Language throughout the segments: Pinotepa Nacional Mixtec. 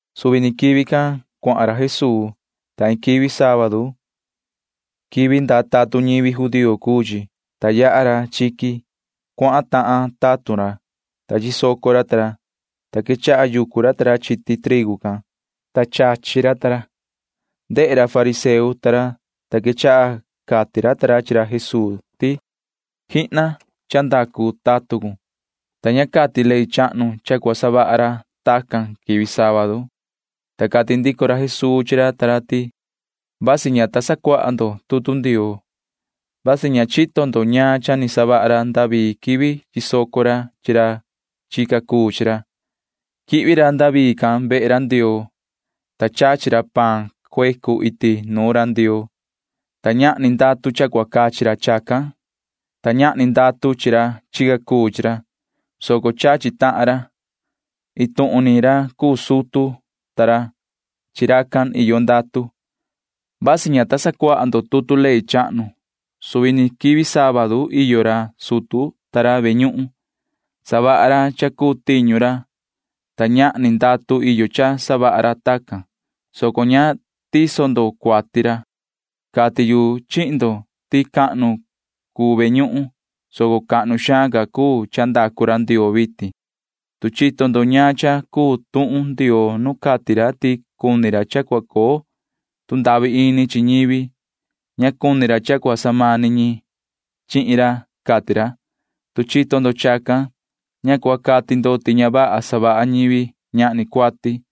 Suvi ni quivi can cuahan ra Jesuu, ta iin quivi sábadu [quivi ndaa tatun ñivi judío cuu chi], ta yaha ra chiqui. Cuahan tahan tatun ra, ta chisoco ra ta ra, ta quechaha yucu ra ta ra chiti trigu can, ta chachi ra ta ra. Ndehe ra fariseo ta ra, ta quechaha cati ra ta ra chi ra Jesuu ti: ―¡Jihna! cha ndacu tatun cun, ta ña chaha ley chahnu cha ndacu ra tacan quivi sábadu ―cati ra ta ra. Ta cati ndico ra Jesuu chi ra ta ra ti: ―Vasi ña ta sacuaha ndo tutu Ndioo. Vasi ña chito ndo ñaan cha ni savaha ra David quivi chisoco ra chi ra chica chi ra. Quihvi ra David can vehe Ndioo, ta chachi ra paan cuecu iti nuun ra Ndioo, ta ñahni ndatu cha cua cachi ra chacan, ta ñahni ndatu chi ra chica chi ra, soco chachi tahan ra. Iin tuhun ni ra cuu sutu ta ra―chi racan iyo ndatu. Vasi ña ta sacuaha ndo tutu ley chahnu. Suvi ni quivi sábadu iyo ra sutu ta ra ve ñuhun. Savaha ra cha cuu tiñu ra, ta ñahni ndatu iyo cha savaha ra tacan, soco ña tiso ndo cuati ra. Cati yu chihin ndo ti cahnu cuu ve ñuhun, soco cahnu xaan ca cuu cha ndacu ra Ndioo vitin. Ña chito ndo ñaan cha cuu tuhun Ndioo nu cati ra ti cuni ra cha cua coo tu ndahvi ini chi ñivi. Ña cuni ra cha cua samani ñi chihin ra, cati ra. Tu chito ndo chacan, ña cua cati ndo ti ña vaha savaha ñivi ñahni cuati iyo.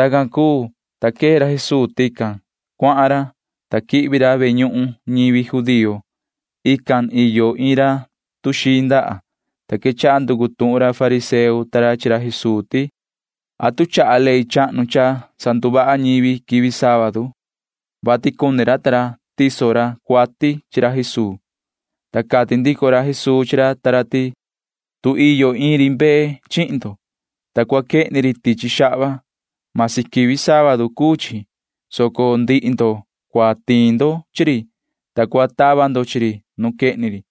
Tacan cuu, ta quee ra Jesuu tican. Cuahan ra, ta quihvi ra ve ñuhun ñivi judío can. Ican iyo iin ra nduxii ndaha, ta quechaha nducu tuhun ra fariseo ta ra chi ra Jesuu ti: ―¿Atu chaha ley chahnu cha sanduvaha ñivi quivi sábadu? ―cati ra ta ra, vati cuni ra ta ra tiso ra cuati ra Jesuu. Ta cati ndico ra Jesuu chi ra ta ra ti: ―Tu iyo iin ri mbee chihin ndo, ta cua quehni ri tichi xahva―masi quivi sábadu cuu chi, soco ndihi ndo cua tiin ndo chi ri, ta cua tava ndo chi ri nu quehni ri.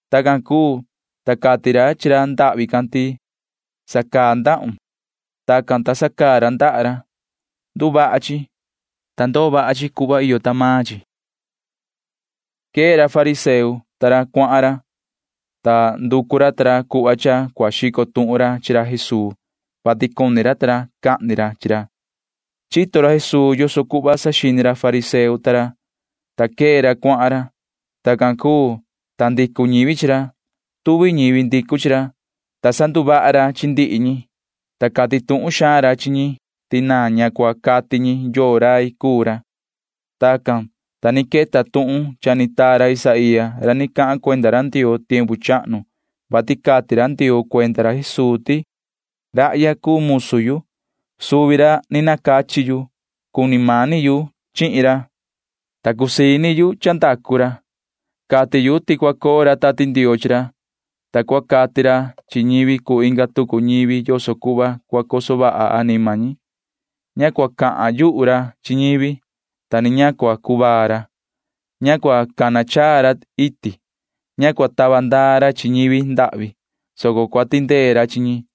Tacan cuu, ta cati ra chi ra ndahvi can ti: ―Sacaun ndahun. Tacan, ta sacaa ra ndaha ra. Nduvaha chi, ta vaha ndoo chi cuhva iyo tahan chi. Quee ra fariseo ta ra cuahan ra, ta nducu ra ta ra cuhva, vati cuni ra ta ra cahni ra chi ra Jesuu. Chito ra Jesuu yoso cuhva saxini ra fariseo ta ra, ta quee ra cuahan ra. Tacan cuu, ta ndicu ñivi chi ra. Tuvi ñivi ndicu chi ra, ta sanduvaha ra chi ndihi ñi, ta cati tuhun xaan ra chi ñi ti na ña cua cati ñi yoo rai cuu ra. Tacan, ta ni queta tuhun cha ni taa ra Isaía ra ni cahan cuenda ra Ndioo tiempu chahnu, vati cati ra Ndioo cuenda ra Jesuu ti: Rahya cuu musu yu. Suvi ra cuu ra cha ni nacachi yu. Cuni mani yu chihin ra, ta cusii ini yu cha ndacu ra. Cati yu ti cua coo ra Tati Ndioo chi ra, ta cua cati ra chi ñivi cuu inga tucu ñivi yoso cuhva cua coso vaha anima ñivi. Ña cua cahan yuhu ra chi ñivi, ta ni ña cua cuvaa ra. Ña cua cana chaa ra iti. Ña cua tava ndaa ra chi ñivi ndahvi, soco cua tindee ra chi ñi.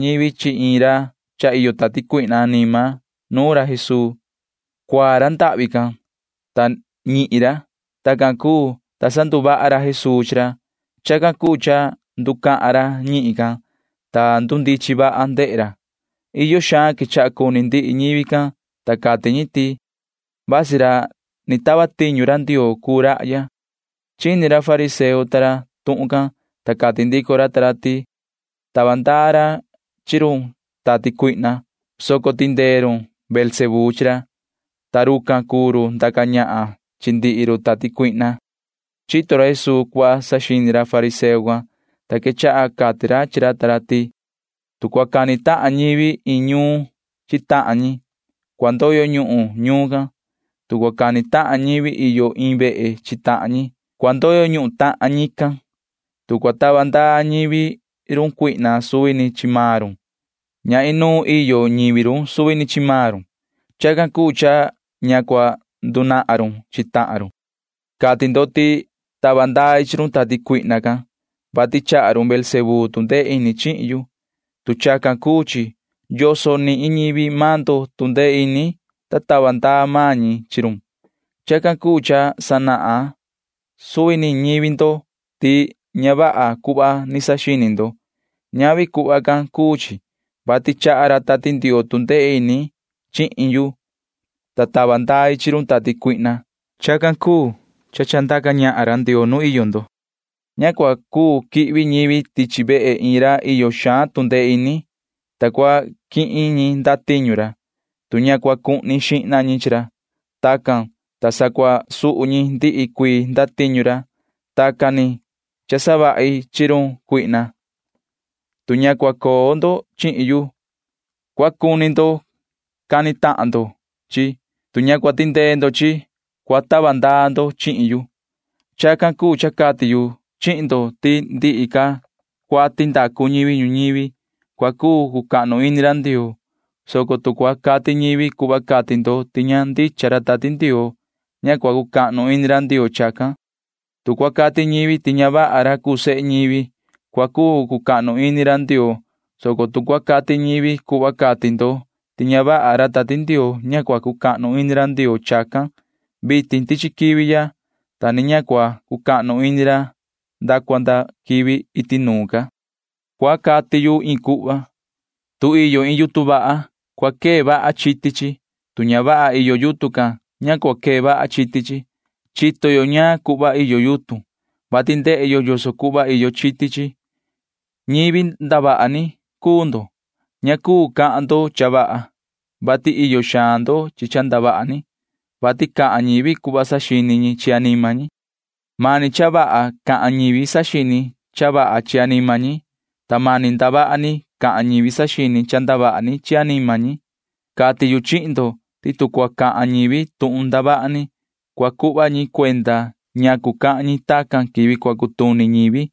Tacan cuu, ta quichi ndaca ñivi chi iin ra cha iyo tati cuihna anima nu ra Jesuu. Cuaa ra ndahvi can, ta ñihin ra. Tacan cuu, ta sanduvaha ra Jesuu chi ra. Chacan cuu cha nducahan ra ñihin can, ta ndundichin vaha ndehe ra. Iyo xaan quechaha cuni ndihi ñivi can, ta cati ñi ti: ―Vasi ra ni tava tiñu ra Ndioo cuu rahya ―cati ñi. Chini ra fariseo ta ra tuhun can, ta cati ndico ra ta ra ti: ―Tava ndaa ra chi run tati cuihna, soco tindee run Beelzebú chi ra, ta rucan cuu run ndaca ñahan chi ndihi run tati cuihna ―cati ra fariseo can. Chito ra Jesuu cuhva ni saxini ra fariseo can, ta quechaha cati ra chi ra ta ra ti: ―Tu cua cani tahan ñivi iin ñuun chi tahan ñi, cua ndoyo ñuhun ñuun can. Tu cua cani tahan ñivi iyo iin vehe chi tahan ñi, cua ndoyo ñuhun tahan ñican. Tu cua tava ndaa ñivi run Satanaa suvi ni chi maan run, ña inuun iyo ñivi run suvi ni chi maan run. Chacan cuu cha ña cua ndunahan run chi tahan run. Cati ndo ti tava ndai chi run tati cuihna can, vati chaha run Beelzebú tu ndee ini chihin yu. Tu chacan cuu chi, ¿yoso nihin ñivi maan ndo tu ndee ini, ta tava ndaa maan ñi chi run? Chacan cuu cha sanahan suvi ni ñivi ndo ti cha ña vaha cuhva ni saxini maan ndo. Ñavi cuhva can cuu chi, vati chaha ra Tati Ndioo tu ndee ini chihin yu, ta tava ndai chi run tati cuihna. Chacan cuu cha ni queta quivi cha ndaca ñahan ra Ndioo nu iyo ndo. ’Ña cua cuu quihvi ñivi tichi vehe iin ra iyo xaan tu ndee ini, ta cua quihin ñi ndatiñu ra, tu ña cua cuhni xihna ñi chihin ra. Tacan, ta sa cua suhu ñi ndihi cuii ndatiñu ra. [Tacan ni cha savahi chi run Satanaa.] ’Tu ña cua coo ndo chihin yu, cua cuni cani tahan ndo chihin yu. Tu ña cua tindee ndo chihin yu, cua tava ndaa ndo chihin yu. ’Chacan cuu cha cati yu chihin ndo ti ndihi ca cuati ndacu ñivi ñuñivi cua cuu cucahnu ini ra Ndioo, soco tu cua cati ñivi cuhva cati ndo ti ña ndicha ra Tati Ndioo, ña cua cucahnu ini ra Ndioo chacan. Tu cua cati ñivi ti ña vaha ra cuu sehe ñivi, cua cuu cucahnu ini ra Ndioo, soco tu cua cati ñivi cuhva cati ndo ti ña vaha ra Tati Ndioo, ña cua cucahnu ini ra Ndioo chacan vitin tichi quivi ya, ta ni ña cua cucahnu ini ra nda cua nda quivi iti nuun ca. [Ni vii cahan ra Jesuu chi ra fariseo can:] ’[Cua cati yu iin cuhva.] Tu iyo iin yutun vaha, cua quee vaha chiti chi. Tu ña vaha iyo yutun can, ña cua quee vaha chiti chi. Chito yo ñaan cuhva iyo yutun, vati ndehe yo yoso cuhva iyo chiti chi. Ñivi ndavaha ni cuu ndo. Ña cuu cahan ndo cha vaha, vati iyo xaan ndo chi cha ndavaha ni, vati cahan ñivi cuhva saxini ñi chi anima ñi. Mani cha vaha cahan ñivi saxini cha vaha chi anima ñi, ta mani ndavaha ni cahan ñivi saxini cha ndavaha ni chi anima ñi. Cati yu chihin ndo ti tu cua cahan ñivi tuhun ndavaha ni, cua cuhva ñi cuenda ñacu cahan ñi tacan quivi cua cutuni ñivi,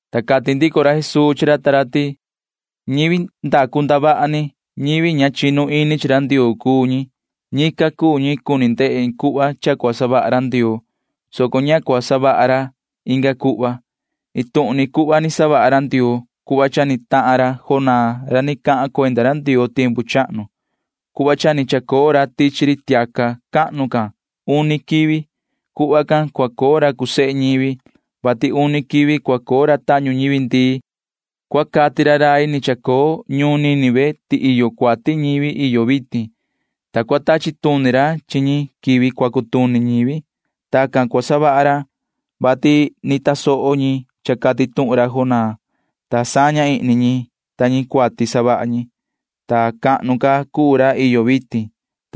Ta cati ndico ra Jesuu chi ra ta ra ti: ―Ñivi ndacu ndavaha ni, ñivi ña chinu ini chi ra Ndioo―ñican cuu ñi cuni ndehe iin cuhva cha cua savaha ra Ndioo, soco ña cua savaha ra inga cuhva. Iin tuhun ni cuhva ni savaha ra Ndioo cuhva cha ni tahan ra Jonaa ra ni cahan cuenda ra Ndioo tiempu chahnu. Cuhva cha ni chacoo ra tichi ri tiaca cahnu can uni quivi―cuhva can cua coo ra cuu sehe ñivi, vati uni quivi cua coo ra tañu ñivi ndii. Cua cati ra rai ni chacoo ñuun Nínive ti iyo cuati chi ñivi iyo vitin, ta cua tachi tuni ra chi ñi quivi cua cutuni ñivi. Tacan cua savaha ra, vati ni tasoho ra cha cati tuhun ra Jonaa, ta saña ihni ra ta ra cuati savaha ra. Vasi cahnu xaan rai cuu ra Jonaa can, soco cahnu ca cuu ra iyo vitin.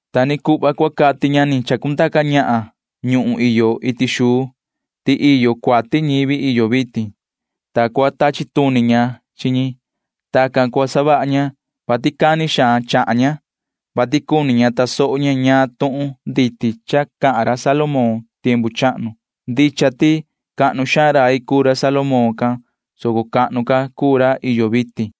Ta ni cuhva cua cati ña ni chandaca ñahan ñuhun iyo iti xuu ti iyo cuati chi ñivi iyo vitin, ta cua tachi tuni ña chi ñi. Tacan cua savaha ña, vati cani xaan chahan ña, vati cuni ña tasoho ña tuhun nditi cha cahan ra Salomón tiempu chahnu. [Ndicha ti] cahnu xaan rai cuu ra Salomón can, soco cahnu ca cuu ra iyo vitin.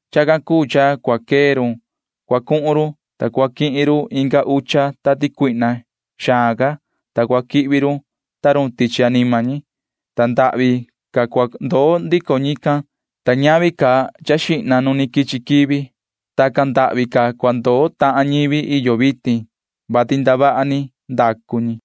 Chacan cuu cha cua quee run cuhun run, ta cua quihin run inga ucha tati cuihna. Xaan ca rucan ta run, ta cua quihvi run ta run tichi anima ñi, ta ndahvi ca cha cua ndoo ndico ñican, ta ñavi ca cha xihna nu ni quichi quivi. Tacan ndahvi ca cua ndoo tahan ñivi iyo vitin, vati ndavaha ni ndacu ñi.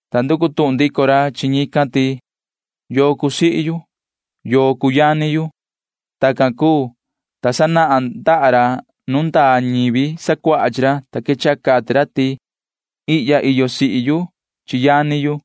Ta nducu tuhun ndico ra chi ñican ti: ―¿Yoo cuu sihi yu? ¿Yoo cuu yani yu? ―cati ra. Tacan cuu, ta sanahan ndaha ra nu ndaa ñivi sacuaha chi ra, ta quechaha cati ra ti: ―Ihya iyo sihi yu chi yani yu.